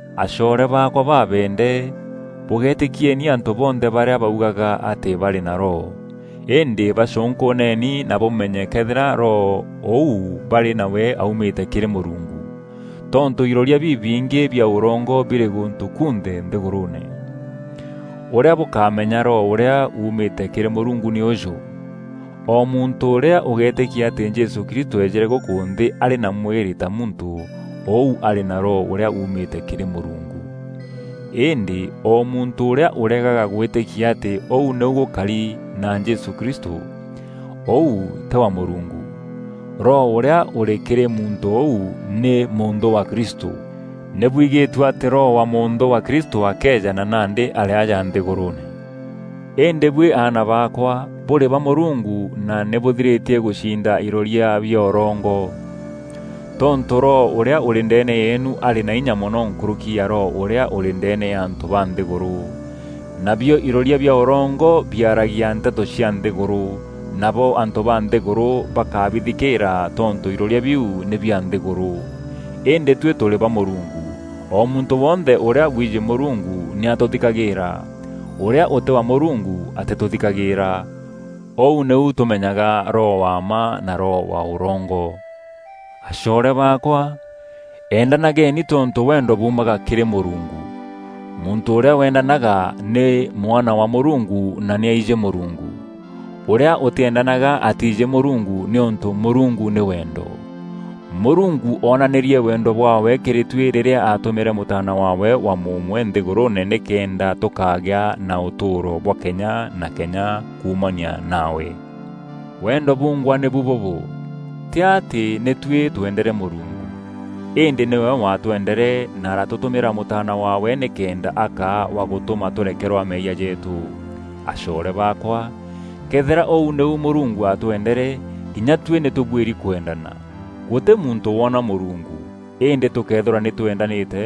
Acoore baakwa babeende, bûgéetîkieni antû bonthe barîa baugaga atî barî na Roho. Îndî bacûnkûûneni na bûmenye këethîra Roho ûu barî nawe aumîte kîrî Mûrungu. Tontû iroria bibingî bia ûrongo birî gûntû kunthe nthîgûrûûne. Ûrîa bûkamenya Roho ûrîa uumîte kîrî Mûrungu nî ûjû: o muntû ûrîa ûgeetîkia atî Jesû Kristû eejîre gûkû nthî arî na mwîrî ta muntû, ûu arî na Roho ûrîa uumîte kîrî Mûrungu. Îndî o muntû ûrîa ûregaga gwîtîkia atî ûu nîu gûkari na Jesû Kristû, ûu tî wa Mûrungu. Roho ûrîa ûrî kîrî muntû ûu nî mûnthû wa Kristû. Nî bwigîtue atî roho wa mûnthû wa Kristû akeeja na nandî arî aja nthîgûrûûne. Îndî buî aana baakwa, bûrî ba Mûrungu na nî bûthirîtie gûcinda iroria bia ûrongo. Tontû Roho ûrîa ûrî ndeene yeenu arî na inya mono nkûrûki ya roho ûrîa ûrî ndeene ya antû ba nthîgûrû. Nabio iroria bia ûrongo biaragia nteto cia nthîgûrû, nabo antû ba nthîgûrû bakabithikîîra tontû iroria biu nî bia nthîgûrû. Îndî tuî tûrî ba Mûrungu. O muntû wonthe ûrîa wiijî Mûrungu nî atûthikagîîra. Ûrîa ûtî wa Mûrungu atîtûthikagîîra. Ûu nîu tûmenyaga Roho wa mma na roho wa ûrongo. Acoore baakwa, eendanageni tontû wendo buumaga kîrî Mûrungu. Muntû ûrîa wendanaga nî mwana wa Mûrungu na nî aijî Mûrungu. Ûrîa ûtîendanaga atiijî Mûrungu nîûntû Mûrungu nî wendo. Mûrungu oonanîrie wendo bwaawe kîrî tuî rîrîa aatûmîre Mûtaana waawe wa mûmwe nthîgûrûûne nîkenda tûkagîa na ûtûûro bwa kenya na kenya kuumania nawe. Wendo bungwa nîbu bûbû: tî atî nî tuî tweendere Mûrungu, îndî nîwe watweendere na aratûtûmîra Mûtaana waawe nîkenda akaa wa gûtûma tûrekerwa meeyia jeetû. Acoore baakwa, këethîra ûu nîu Mûrungu atwendere, kinya tuî nî tûbuîri kwendana. Gûtî muntû woona Mûrungu, îndî tûkëethîrwa nî twendanîte,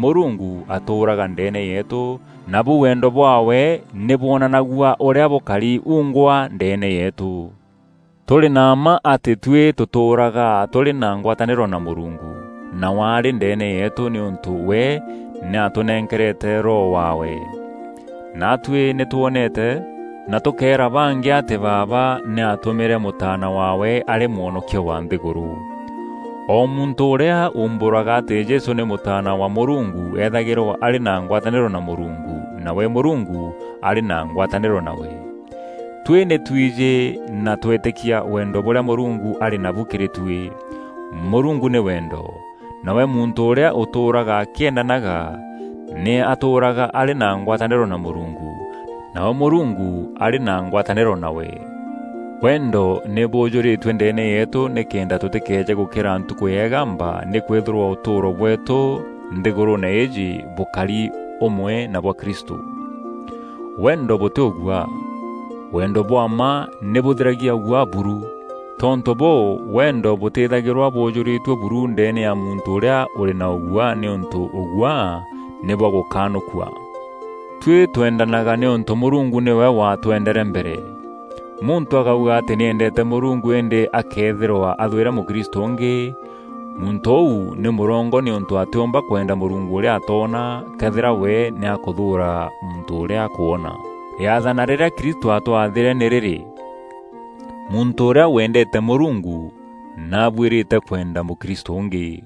Mûrungu atûûraga ndeene yeetû nabu wendo bwaawe nî bwonanagua ûrîa bûkari uungwa ndeene yeetû. Tûrî na mma atî tuî tûtûûraga tûrî na ngwatanîro na Mûrungu, nawe arî ndeene yeetû nîûntû we nî atûnenkerete Roho waawe. Naatuî nî twoonete na tûkeera bangî atî Baaba nî aatûmîre Mûtaana waawe arî Mwonokia wa nthîgûrû. O muntû ûrîa uumbûraga atî Jesû nî Mûtaana wa Mûrungu eethagîrwa arî na ngwatanîro na Mûrungu, nawe Mûrungu arî na ngwatanîro nawe. Tuî nî twijî na twetîkia wendo bûrîa Mûrungu arî nabu kîrî tuî. Mûrungu nî wendo, nawe muntû ûrîa ûtûûraga akîendanaga, nî atûûraga arî na ngwatanîro na Mûrungu, nawe Mûrungu arî na ngwatanîro nawe. Wendo nî buujûrîtue ndeene yeetû nîkenda tûtîkeeje gûkîra Ntukû ya îgamba nîkwîthîrwa ûtûûro bweetû nthîgûrûûne îîjî bûkari ûmwe na bwa Kristû. Wendo bûtî ûguaa; Wendo bwa mma nî bûthiragia ûguaa buru. Tontû bûû, wendo bûtîthagîrwa bûûjûrîtue buru ndeene ya muntû ûrîa ûrî na ûguaa nîûntû ûguaa nî bwa gûkanûkua. Tuî twendanaga nîûntû Mûrungu nîwe watwendere mbere. Muntû akauga atî nî endete Mûrungu îndî akëethîrwa athwîre mûkristû ûngî, muntû ûu nî mûrongo nîûntû atîûmba kwenda Mûrungu ûrîa atoona, këethîra we nî akûthûûra muntû ûrîa akwona. Rîathana rîrîa Kristû aatwathîre nî rîrî: muntû ûrîa wendeete Mûrungu, nî abuîrîte kwenda mûkristû ûngî.